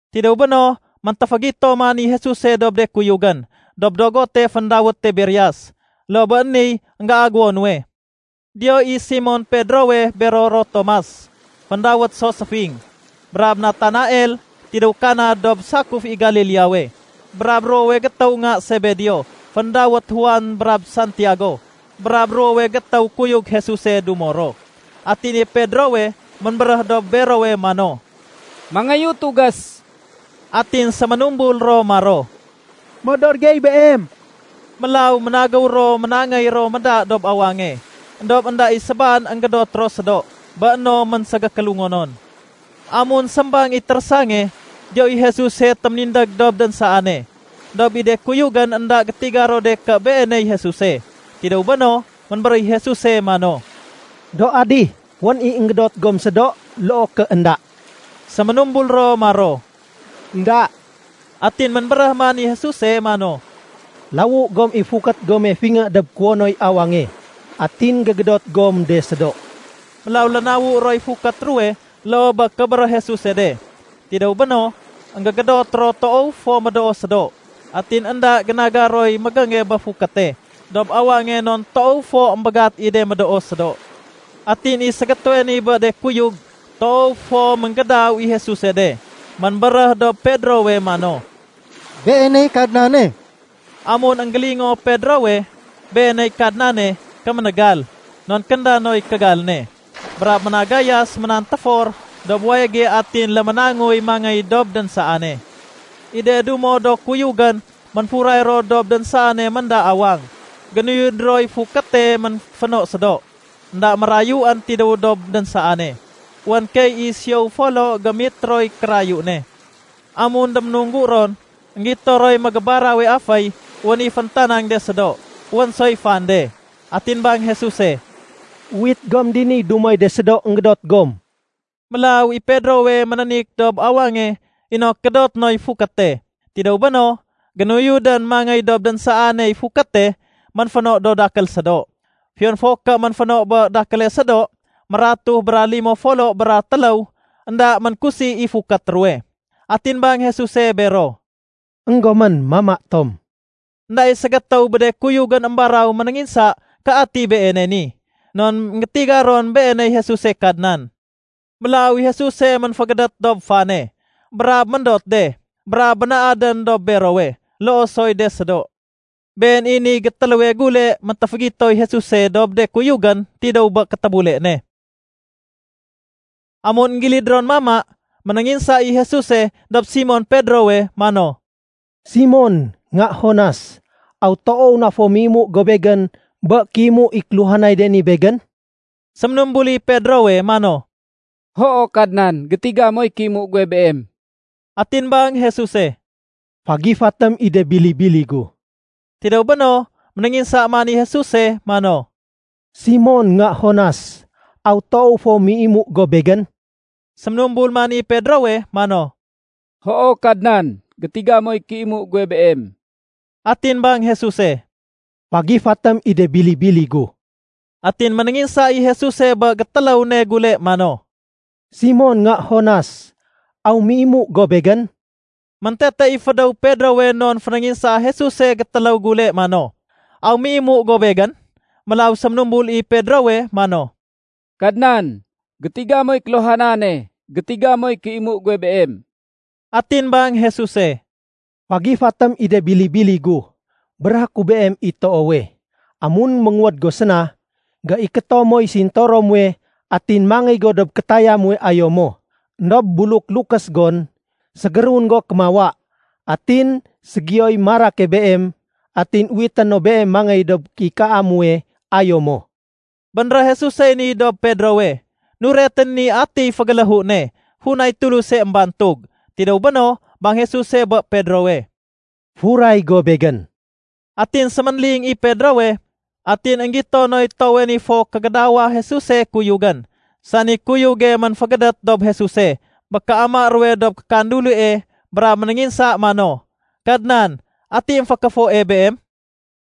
Tidéw béno, méntéfégito man i Jesuse dob de kuyugén dob dogote féndawét Tiberias. Loo bé niy énggéagéwo nuwe. Diyo i Simon Pedrowe bero ro Tomas (féndawét so Séfing) brab Natanael tidéw Kana dob sakuf i Galileawe, brab ruwowe gétéw nga Sebedeo féndawét Juan brab Santiago, brab ruwowe gétéw kuyug Jesuse dumo ro. Atin i Pedrowe ménbéréh dob berowe mano, “Mangéyu tugés.” Atin séménumbul ro maro, “Modor gey beem.” Mélaw ménagéw ro ménangéy ro méda dob awange. Endob énda i sébaan énggédot ro sédo bé no ménségékélungonon. Amun sémbang i térésange, diyo i Jesuse téménindég dob dénsaane. Endob i de kuyugén énda gétiga ro de ké Beeney Jesuse. Tidéw béno, ménbéréh i Jesuse mano, “Do adih, wén i énggédot gom sédo loo ké énda?” Séménumbul ro maro, “Enda.” Atin ménbéréh man i Jesuse mano, “Lawu gom i fukét gome fingé dob kuwonoy awange atin gégédot gom de sédo.” Mélaw lénawu roy fukét ruwe loo bé kébéréh Jesuse de. Tidéw béno, énggégédot ro toow fo médoo sédo. Atin énda génaga roy mégénge bé fukéte dob awange non toow fo émbégat i de médoo sédo. Atin i ségétéwe ni bé de kuyug toow fo ménggédaw i Jesuse de, ménbéréh dob Pedrowe mano, “Beeney Kadnane!” Amun énggélingoo Pedrowe, “Beeney Kadnane”, kéménégal (non kénda noy kégal ne) brab ménagayas ménantéfor dob wayége atin léménangoy mangéy dob dénsaane. I de dumo do kuyugén ménfuray ro dob dénsaane ménda awang, génuyud roy fukéte ménféno sédo. Enda mérayuén tidéw dob dénsaane, wén keey i siyow folo gémitroy kérayu ne. Amun déménunggu ron, énggito roy mégébarawe aféy wén i féntanang de sédo. Wén soy fan de. Atin bang Jesuse, “Uwit gom diniy dumoy de sédo énggédot gom.” Mélaw i Pedrowe ménénik dob awange inok gédoté noy fukéte. Tidéw béno, génuyudén mangéy dob dénsaaney fukéte ménféno do dakél sédo. Fiyon fo ké ménféno bé dakéle sédo, mératuh bra limo folo bra téléw, énda ménkusi i fukét ruwe. Atin bang Jesuse bero, “Enggomén, mama tom.” Enda i ségétéw bé de kuyugén émbaraw ménénginsa ké ati Beene ni, non énggétiga ron Beeney Jesuse Kadnan. Mélaw i Jesuse ménfégédét dob fane brab méndot de brab bénaadén dob berowe, loo soy de sédo. Been i niy gétéléwe gule méntéfégitoy Jesuse dob de kuyugén tidéw bé kétébule ne. Amun énggilid ron mama, ménénginsa i Jesuse dob Simon Pedrowe mano, “Simon, nga Jonas, aw toow na fo méimu go Begén bé kéimu i kéluhanay de ni Begén?” Séménumbul i Pedrowe mano, “Hoo Kadnan, gétiga moy kéimu guwe Beem.” Atin bang Jesuse, “Fagifatém i de bili-bili gu.” Tidéw béno, ménénginsa man i Jesuse mano, “Simon, nga Jonas, aw toow fo méi mu go Begén?” Séménumbul man i Pedrowe mano, “Hoo Kadnan, gétiga moy kéimu guwe Beem.” Atin bang Jesuse, “Fagifatém i de bili-bili gu.” Atin ménénginsa i Jesuse bé gétéléw ne gule mano, “Simon, nga Jonas, aw méimu go Begén?” Méntete i fédéw Pedrowe non fénénginsaa Jesuse gétéléw gule mano, “Aw méimu go Begén?” Mélaw séménumbul i Pedrowe mano, “Kadnan, gétiga moy kéluhanane, gétiga moy kéimu guwe Beem.” Atin bang Jesuse, “Fagifatém i de bili-bili gu. Béréhé ku beem i toowe, amun ménguwéd go séna, géikéto moy sintoro muwe, atin mangéy go dob kétaya muwe ayo mo. Endob buluk lukés gon, ségérun go kémawa, atin ségiyoy marake beem atin uwité no beem mangéy dob kéikaa muwe ayo mo.” (Bénréh Jesusey ni dob Pedrowe nuretén i atiy fégéléhu ne funay Tuluse émbantug.) Tidéw béno, bang Jesuse bé Pedrowe, “Furay go Begén.” Atin séménling i Pedrowe, atin énggito noy toowe ni fo kégédawa Jesuse kuyugén, sani kuyuge ménfégédét dob Jesuse bé kéama ruwe dob kékandulie brab ménénginsa mano, “Kadnan, ati émfékéfoe Beem?”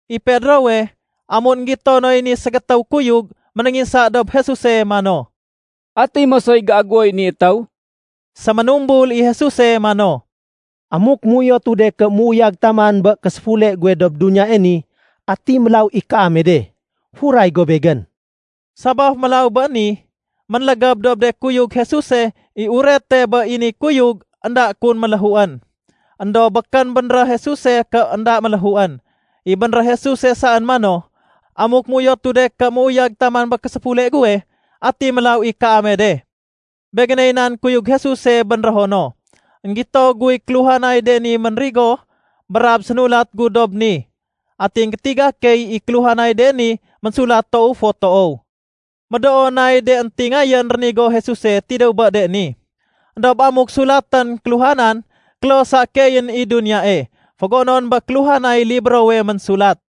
I Pedrowe, amun énggito noy ni ségétéw kuyug, ménénginsa dob Jesuse mano, “Ati mosoy géagéwoy ni étéw?” Séménumbul i Jesuse mano, “Amuk méuyotu de ké méuyag taman bé késéfule guwe dob duniyae ni, ati mélaw i kaame de? Furay go Begén.” Sabaf mélaw bé ni, ménlégéb dob de kuyug Jesuse i urete bé i ni kuyug énda kun méléhuén. Endob békén bénréh Jesuse ké énda méléhuén. I bénréh Jesuse saén mano, “Amuk méuyotu de ké méuyag taman bé késéfule guwe, ati mélaw i kaame de?” Begéney nan kuyug Jesuse bénrého no! Enggito guy kéluhanay de ni ménrigo brab sénulat gu dob ni. Atin gétiga key i kéluhanay de ni ménsulat toow fo toow. Médoo nay de éntingayén rénigo Jesuse tidéw bé de ni. Endob amuk sulatén kéluhanan, kloh sa keeyén i duniyae fégonon bé kéluhanay librowe ménsulat.